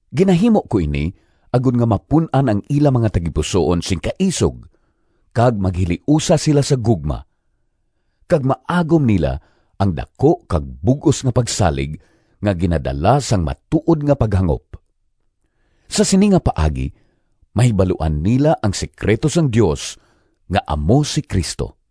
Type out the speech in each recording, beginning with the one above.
Ginahimo ko ini, agod nga mapun-an ang ila mga tagipusoon sing kaisog kag maghiliusa sila sa gugma, kag maagom nila ang daku kag bug-os nga pagsalig nga ginadala sang matuod nga paghangop. Sa sini nga paagi mahibaluan nila ang sekrito sang Dios nga amo si Cristo.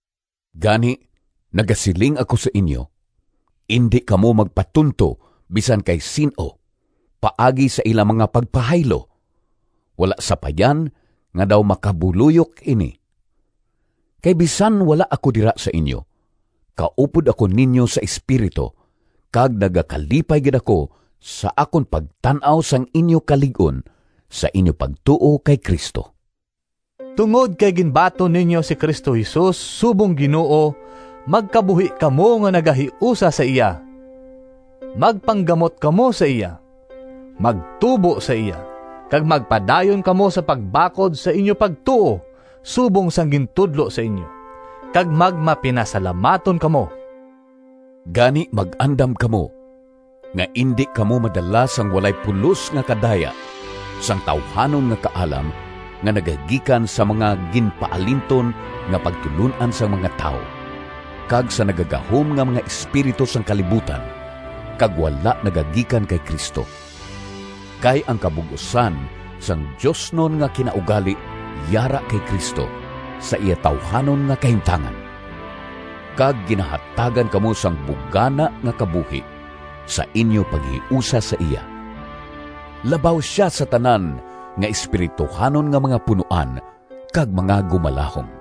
Gani nagasiling ako sa inyo: indi kamo magpatunto bisan kay sin-o paagi sa ila nga mga pagpahaylo, wala sapayan nga daw makabuloyok ini. Kay bisan wala ako dira sa inyo, kaupod ako ninyo sa espiritu kag nagakalipay gid ako sa akon pagtan-aw sang inyo kalig-on sa inyo pagtuo kay Cristo. Tungod kay ginbaton ninyo si Cristo Jesus subong Ginoo, magkabuhi kamo nga nagahiusa sa iya. Magpanggamot kamo sa iya, magtubo sa iya, kag magpadayon kamo sa pagbakod sa inyo pagtuo subong sang gintudlo sa inyo. Kag magmapinasalamaton kamo. Gani mag-andam kamo nga indi kamo madala sang walay pulos nga kadaya sang tawuhanon nga kaalam nga nagagikan sa mga ginpaalinton nga pagtulon-an sang mga tawo, kag sa nagagahom nga mga espiritu sang kalibutan, kag wala nagagikan kay Cristo. Kay ang kabug-osan sang diosnon nga kinaugali yara kay Cristo sa iya tawuhanon nga kahimtangan, kag ginahatagan kamo sang bugana nga kabuhi sa inyo paghiusa sa iya. Labaw sia sa tanan nga espirituhanon nga mga punoan kag mga gumalahom.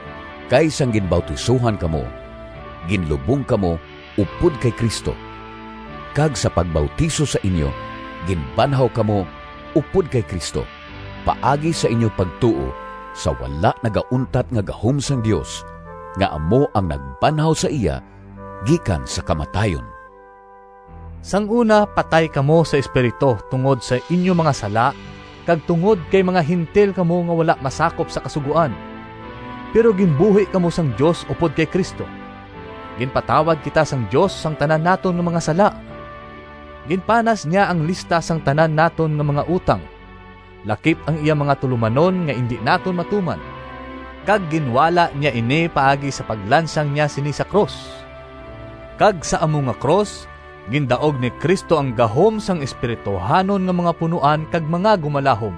Kay sang ginbautisohan kamo, ginlubong kamo upod kay Cristo, kag sa pagbautiso sa inyo ginbanhaw kamo upod kay Cristo paagi sa inyo pagtuo sa wala nagauntat nga gahom sang Dios nga amo ang nagbanhaw sa iya gikan sa kamatayon. Sang una, patay kamo sa espiritu tungod sang inyo mga sala kag tungod kay mga Gentil kamo nga wala masakop sa Kasugoan. Pero ginbuhi kamo sang Dios upod kay Cristo! Ginpatawad kita sang Dios sang tanan naton nga mga sala. Ginpanas niya ang lista sang tanan naton nga mga utang, lakip ang iya mga tulomanon nga indi naton matuman, kag ginwala niya ini paagi sa paglansang niya sini sa krus. Kag sa amo nga krus gindaog ni Cristo ang gahom sang espirituhanon nga mga punoan kag mga gumalahom.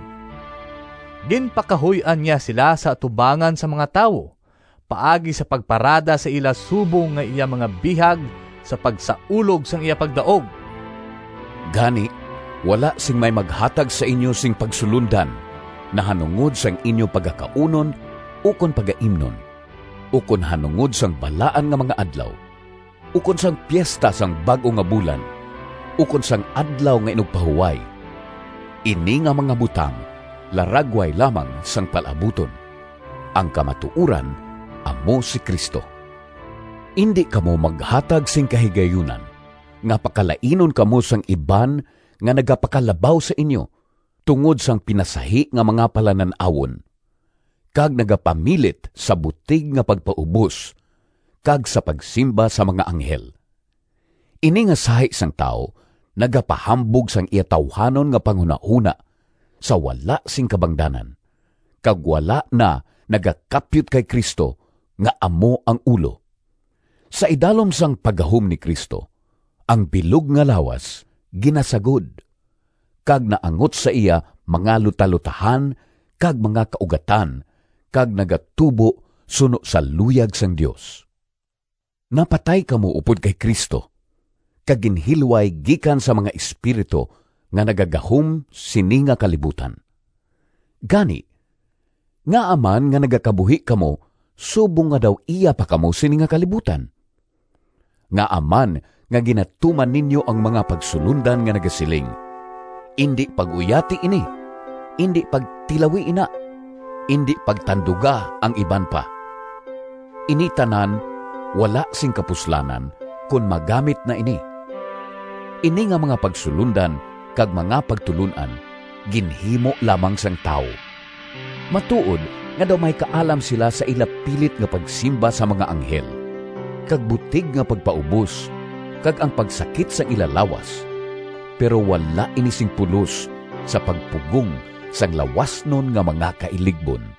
Ginpakahuy-an niya sila sa atubangan sang mga tawo paagi sa pagparada sa ila subong nga iya mga bihag sa pagsaulog sang iya pagdaog. Gani wala sing may maghatag sa inyo sing pagsulondan nahanungod sang inyo pagakaunon ukon pagaimnon, ukon nahanungod sang balaan nga mga adlaw, ukon sang piesta sang bag-o nga bulan, ukon sang Adlaw nga Inugpahuway. Ini nga mga butang laragway lamang sang palaabuton. Ang kamatuoran amo si Cristo. Indi kamo maghatag sing kahigayunan nga pakalainon kamo sang iban nga nagapakalabaw sa inyo tungod sang pinasahi nga mga palanan-awon, kag nagapamilit sa butig nga pagpaubos kag sa pagsimba sa mga anghel. Ini nga sahi sang tawo nagapahambog sang iya tawuhanon nga panghunahona sa wala sing kabangdanan, kag wala na nagakapyot kay Cristo nga amo ang ulo. Sa idalom sang paggahom ni Cristo ang bilog nga lawas ginasagod, kag naangot sa iya mga lutalotahan kag mga kaugatan kag nagatubo suno sa luyag sang Dios. Napatay kamo upod kay Cristo kag ginhilway gikan sa mga espiritu nga nagagahom sini nga kalibutan. Gani, ngaa man nga nagakabuhi kamo subong nga daw iya pa kamo sini nga kalibutan? Ngaa man nga ginatuman ninyo ang mga pagsulondan nga nagasiling, “Indi pag-uyati ini,” “Indi pagtilawi ina,” “Indi pagtanduga ang iban pa”? Ini tanan wala sing kapuslanan, kon magamit na ini. Ini nga mga pagsulondan kag mga pagtulon-an ginhimo lamang sang tawo. Matuod nga daw may kaalam sila sa ila pilit nga pagsimba sa mga anghel kag butig nga pagpaubos kag ang pagsakit sang ila lawas, pero wala ini sing pulos sa pagpugong sang lawasnon nga mga kailigbon.